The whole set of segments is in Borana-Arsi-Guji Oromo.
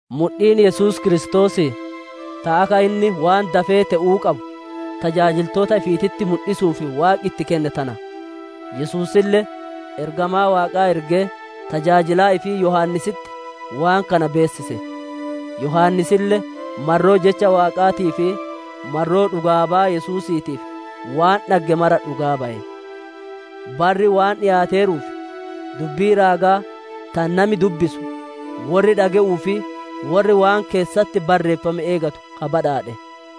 Mudhiin Yesuus Kiristoosii, ta akka inni waan dafee te'uu qabu tajaajiltoota ifiititti mudhisuuf Waaqi itti kenne tana; Yesuusille ergamaa Waaqaa ergee tajaajilaa ifii Yohaannisitti waan kana beessise. Yohaannisille marroo Jecha Waaqaatii fi marroo dhugaa baya Yesuusiitiif waan dhagge mara dhugaa baye. Barri waan dhiyaateeruuf, dubbii raagaa tana nami dubbisu, worri dhage'uu fi worri waan keessatti barreeffame eeggatu ka badhaadhe.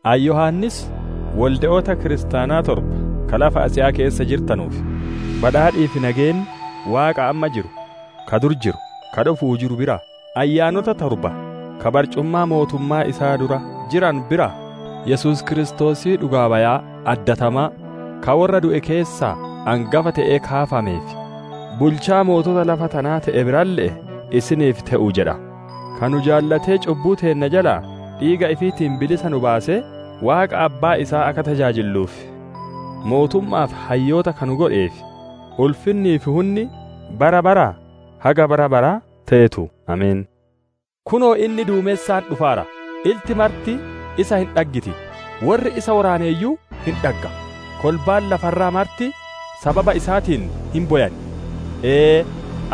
Ani Yohaannis, wolde'oota kiristaanaa torba ka lafa Asiyaa keessa jirtanuuf: Badhaadhii fi nageenni Waaqa amma jiru, ka duri jiru, ka dhufu'uu jiru biraa, ayyaanota torba ka barcumaa mootummaa isaa dura jiranu biraa, Yesuus Kiristoosii dhugaa-bayaa addatamaa, ka worra du'e keessaa angafa te'ee kaafamee fi bulchaa mootota lafa tanaa te'e biralle'ee isiniif te'u jedha. Ka nu jaalatee cubbuu teenna jalaa dhiiga ifiitiin bilisa nu baasee, Waaqa Abbaa isaa akka tajaajilluuf mootumma'aa fi hayyoota ka nu godheef, ulfinnii fi hunni bara baraa, haga bara baraa teetu! Ameen. Kunoo, inni duumensaan dhufaara, ilti marti isa hin dhaggiti; worri isa woraaneeyyuu hin dhagga; kolbaan lafa irraa marti sababa isaatiin hin bowan. Ee!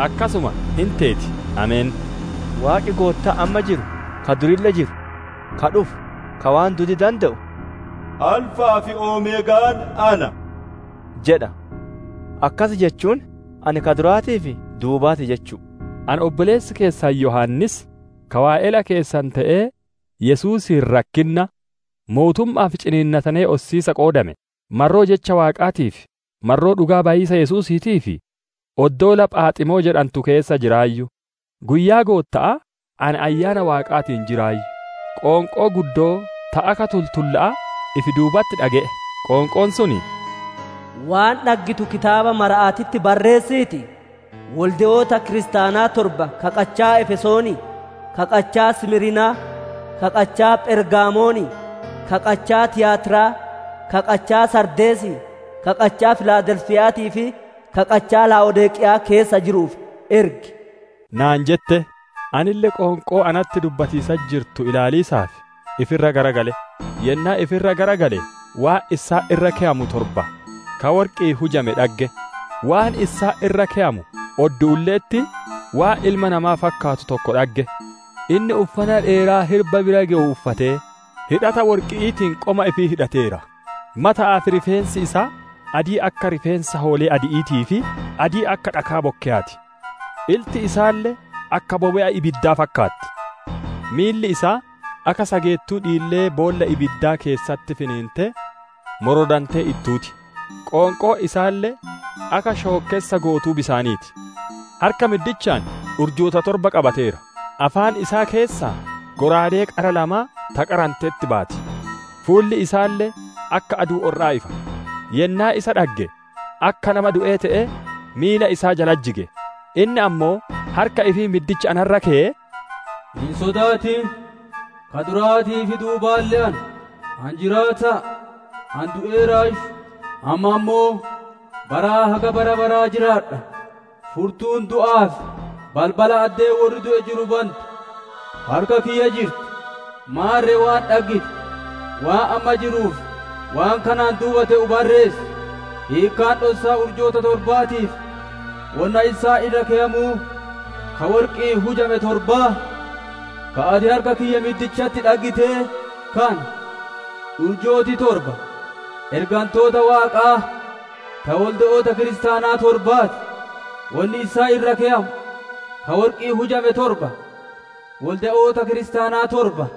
Akkasuma hin teeti. Ameen. Waaqi Goottaan amma jiru, ka durille jiru, ka dhufu, ka waan duudii dande'u, «Alfa'aa fi Omeegaan Ana» jedha; [akkasi jechuun ani ka duraatii fi duubaati jechu'u]. Ani obboleessi keessan Yohaannis, ka waa'ela keessan te'ee Yesuusiin rakkinna, mootumma'aa fi ciniinnatanee ossiisa qoodame, marroo Jecha Waaqaatii fi marroo dhugaa-bayiisa Yesuusiitiif oddoola Phaaximoo jedhantu keessa jiraayyu. Guyyaa Gootta'aa, ani Ayyaana Waaqaatiin jiraayyu; qoonqoo guddoo ta akka tultulla'aa ifi duubatti dhage'e. Qoonqoon sun, «Waan dhaggitu kitaaba marama'atti barreessiitii, wolde'oota kiristaanaa torba ka qachaa Efesoonii, ka qachaa Simiirnaa, ka qachaa Phergamoonii, ka qachaa Tiyaatiraa, ka qachaa Saardeesii, ka qachaa Filaadelfiya'aatii fi ka qachaa Laa'odiiqeya'aa keessa jiruuf ergi!» naan jette. Anille qoonqoo natti dubbatiisatti jirtu ilaaliisaaf ifi irra garagale; yennaa ifi irra garagale waan issaan irra keyamu torba ka worqi'iin hujame dhagge; waan issaan irra keyamu odduulle'etti waan ilma namaa fakkaatu tokko dhagge; inni uffana dheeraa hirba bira gewu uffatee, hidhata worqi'iitiin qoma ifii hidhateera. Mata'aa fi rifeensi isaa adii akka rifeensa hoolee adi'iitii fi adii akka dhakaa bokkeyaa ti; ilti isaalle akka bobe'a ibiddaa fakkaatti. Miilli isaa akka sageettuu dhiillee boolla ibiddaa keessatti finiintee morodantee ittuu ti; qoonqoon isaalle akka shookkessa gootuu bisaanii ti. Harka middichaan urjoota torba qabateera; afaan isaa keessaa shallaagaa qara lamaa ka qarametti baya; fuulli isaalle akka aduu orra'aa ifa. Yennaa isa dhagge akka nama du'ee te'ee miila isaa jallatti jige. Inni ammoo harka ifii middicha ana irra keyee, «Hin sodaatin! Ka duraatii fi duubaalle ana; ani Jiraata'a; ani du'eeraayyu, amma ammoo baraa haga bara baraa jiraadha; furtuun du'aa fi balbala addee worri du'e jiru bantu harka kiyya jirti. Maarre waan dhaggite, waan amma jiruu fi waan kanaan duuba te'u barreessi. Hiikkaan dhossaa urjoota torbaatii fi wonna issaan irra keyamuu ka worqi'iin hujame torbaa, ka ati harka kiyya middichatti dhaggitee kana: Urjooti torba ergantoota Waaqaa ta wolde'oota kiristaanaa torbaa ti; wonni issaan irra keyamu ka worqi'iin hujame torba, wolde'oota kiristaana torba.